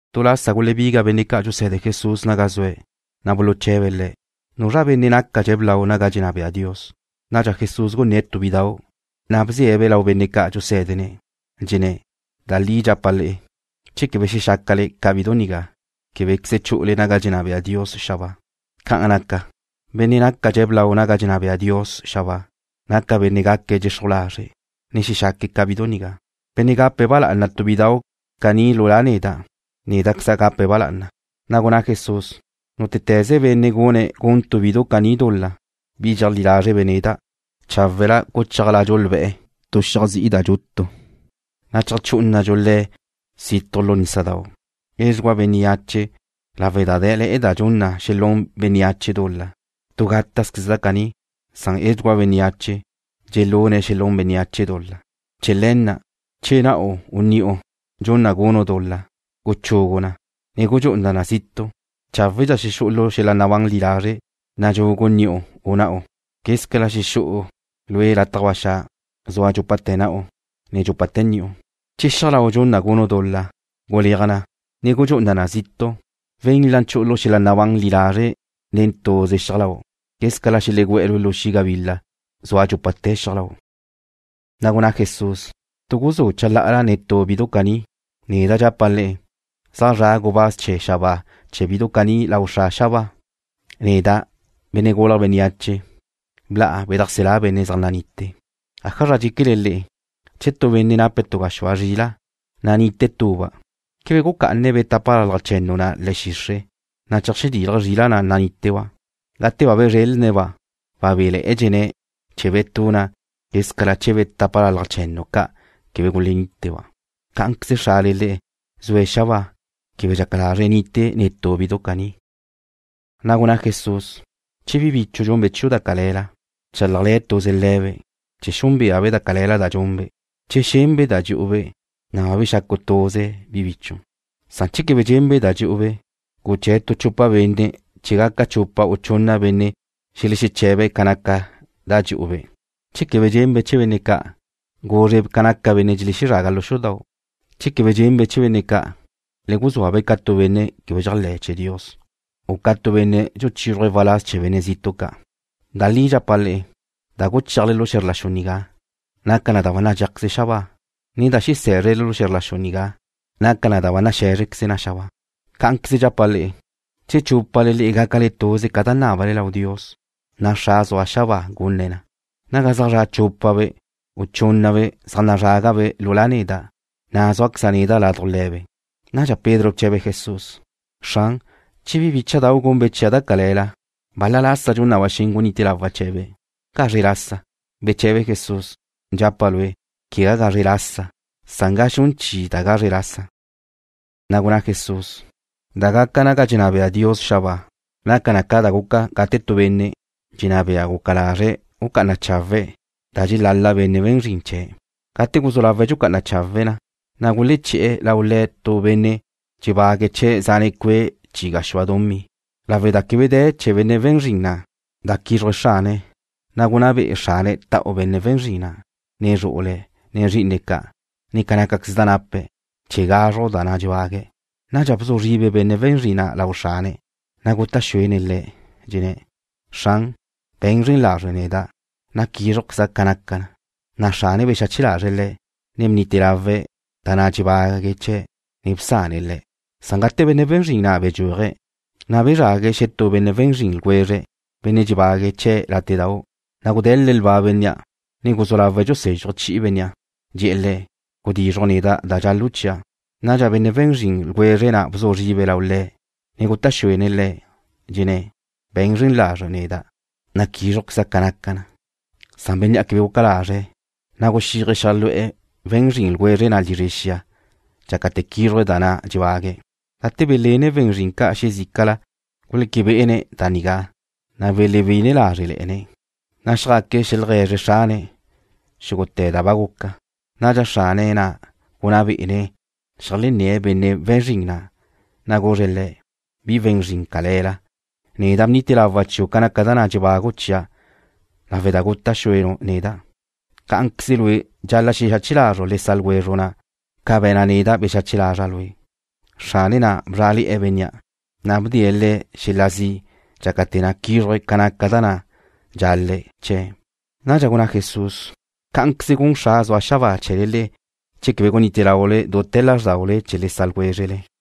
Tu lasa gulebiga benne' ca' dxuse̱de Jesús naga zue̱', na' buluche̱be̱' Le̱': ―¿Nuzra benne' nácadxe̱' blau naga dxenná bea Dios? Nadxa Jesús gunné̱' tu bidau', na' bze̱'-be' lau benne' ca' dxusé̱dene̱'. Dxenné̱': ―Da li dxapa' le'e, che quebe xexácale ca bidu nigá, québequeze chu'ule naga dxenná bea Dios xabáa. Ca'an naca, benne' nácadxe̱' blau naga dxenná bea Dios xabáa, naca benne' gaque̱' dxexruj lazre', ne xexaque̱' ca bidu nigá. Benne' gape̱' ba lá'ana tu bidau' caní lu La' neda', néda'queza' gape̱' ba lá'ana. Na' gunná Jesús: ―Nútete̱ze benne' gune̱' gun tu bidu caní dul-la, bi dxeajlí lázrebe' neda', cháwela guchéajladxu lbe̱'e̱ tu xiaj zi'i da dxutu, na' cheajchú'unadxu le̱' situj lu nísadau'. Edxugúa bénneache lawe' da dé̱le̱'e̱ da dxun na xelún bénneache dul-la. Tu gátazqueze da caní, na' edxugúa bénneache dxelune̱' xelún bénneache dul-la. Chee̱ le̱ na', che na'u u ni'u dxun na gunu' dul-la, guchugu na, ne gudxú'una na zitu'. Cháwedxa xexú'u lu xel-la' nabán li lazre' nadxugu ni'u u na'u, quézcala xelegú'e̱ lue' lataj ba xa', zua dxúpate̱ na'u, ne dxúpate̱ ni'u. Che xiaj lau' dxun na gunu' dul-la, guleaj na, ne gudxú'una na zitu'. Wenla chu'u lu xel-la' nabán li lazre' nen tuze xiaj lau', quézcala xelegú'e̱ lue' lu xi' gabila, zua dxúpate̱ xiaj lau'. Na' gunná Jesús: ―Gutu guzú' chalá'ala netú bidu caní. Neda' dxapa' le'e, zaj zra' gubáz chee̱ xabáa chee̱ bidu caní lau Xra' xabáa. Neda', Benne' Gulje̱' Bénneache, bla'a bedajselá' benne' zaj nanitie̱'. ’¿Ájazra dxéquele le'e? Che tu benne' nape̱' tu gaxúa zrila', na' nite tuba', ¿quebe gucá'ane̱' be̱ tápalalaj che̱nnu na' le̱'e̱ xixre', na' cheajdilje̱' zrila' na' naníteba'? Gate ba bezrelne̱'-ba', wabéle̱'e̱dxene̱' chee̱ be̱ tu na' quézcala chee̱ be̱ tápalalaj che̱nnu ca' quebe guleníteba'. Cá'anqueze Xrale le'e, zue̱' xabáa, quebe dxaca lazre̱' nite netú bidu caní. Na' gunná Jesús: ―Che bi bichu' dxunbe' chiu' da cale̱la, bchálajle̱ tuze le̱be', chee̱ xúnbeabe' da cale̱la da be̱nbe'. Che xenbe' da dxu'u-be', na' ba bexacu' tuze bi bichu'. Che quebe xenbe' da dxu'u-be', guché̱' tu chupa benne' chee̱ gaca chupa u chunna benne' xelexeche̱be̱' ca naca da dxu'u-be'. Che quebe xenbe' chee̱ benne' ca', guzre ca naca benne' dxelezraga lu xudau'. Che quebe xenbe' chee̱ benne' ca', le guzúa-be' ca tu benne' quebe dxéajle̱'e̱ chee̱ Dios, u ca tu benne' dxuchízruje̱' waláz chee̱ benne' zitu' ca'. ’Da li dxapa' le'e, da guchéajle lu xe̱zr la xu nigá, naca na da ba nadxéajqueze na xabáa, ne da xesé̱zrele lu xe̱zr la xu nigá naca na da ba nazé̱zrequeze na xabáa. ’Cá'anqueze dxapa' le'e, che chúpale le'e gácale tuze ca da nábale Dios, na' Xra' zua xabáa gunne̱' na. Naga zaj zra' chúpabe', u chúnnabe' zaj nazrágabe' lu La' neda', na' zúaqueza' neda' laduj le̱be'. Nadxa Pedro bche̱be̱' Jesús: ―Xran, che bi bícha'dau' gunbe' chia' da cale̱la, ¿bal-la lasa dxun na ba xen gunite lawa' chee̱be'? ¿Gazre lasa? Beche̱be Jesús: ―Dxapa' lue', quegá gazre lasa, san ga xun chi da gazre lasa. Na' gunná Jesús: ―Da gaca naga dxenná bea Dios xabáa naca na ca da guca gate tu benne' dxenná bea guca lazre̱' gucá'ana chawe̱' da dxelal-la benne' we̱n zrin chee̱'. Gate guzú lawe̱' dxucá'ana chawe̱' na, na' guleché̱'e̱ lau le̱' tu benne' dxebague̱' chee̱' zane' cue' chi gaxúa dumí. Lawe' da quebe de̱ chee̱ benne' we̱n zrin na' da quízruje̱' xrane̱', na' gunná be'e xrane̱' ta'u benne' we̱n zrin na', ne zru'ule̱', ne zrí'ine̱' ca', ne ca nácaqueze da nape̱', chee̱ gazruj da na' dxebague̱'. Nadxa bzu zribe benne' we̱n zrin na' lau xrane̱', na' guta' xuene̱' le̱', dxenné̱': “Xran, be̱n zren lazre' neda', na' quízrujqueza' ca naca na.” Na' xrane̱' bexache lazre̱' le̱', ne bnite lawe̱' da na' dxebague̱' chee̱', ne bsane̱' le̱'. Gate benne' we̱n zrin na' bedxúaje̱', na' bezrague̱' xetú benne' we̱n zrin ljwezre̱', benne' dxebague̱' chee̱' látedau'. Na' gude̱le̱' lba bénnea', ne guzú lawe̱' dxusézxuje̱' chi'i bénnea', dxe̱'e̱ le̱': “Gudizruj neda' da dxal-lu' chia'.” Nadxa benne' we̱n zrin ljwezre̱' na' bzu zribe̱' lau le̱', ne guta' xuene̱' le̱', dxenné̱': “Be̱n zren lazre' neda', na' quízrujqueza' ca naca na.” Bénnea' quebe guca lazre̱', na' guxíaje̱' xeajlu'e̱ we̱n zrin ljwezre̱' na' lizre xia dxácate̱ quízruje̱' da na' dxebague̱'. Gate benne' we̱n zrin ca' xezícala guleque bé'ene̱' da nigá, na' belewí'ine lázrele̱'e̱ne̱', na' xjaque̱' xeajlegue̱zre̱' xrane̱' xúgute̱ da ba guca. Nadxa xrane̱' na' gunná bé'ene̱' xeajlenné̱' benne' we̱n zrin na', na' guzre̱' le̱': “Bi we̱n zrin cale̱la. Neda' bnite lawa' chiu' ca naca da na' dxebagu' chia' lawe' da guta' xúenu' neda'. Cá'anqueze lue' dxal-la' xexache lazru' le sa' ljwezru' na' ca be̱na' neda' bexache lazra' lue'.” Xrane̱' na' bzrá'ale̱'e̱ bénnea', na' bdee̱' le̱' xel-la' zi' dxácate̱ na' quízruje̱' ca naca da na' dxal-le̱' chee̱'. Nadxa gunná Jesús: ―Cá'anqueze gun Xra' zua xabáa chee̱le le'e che quebe gunite laule dute̱ lázrdaule chee̱ le sa' ljwézrele.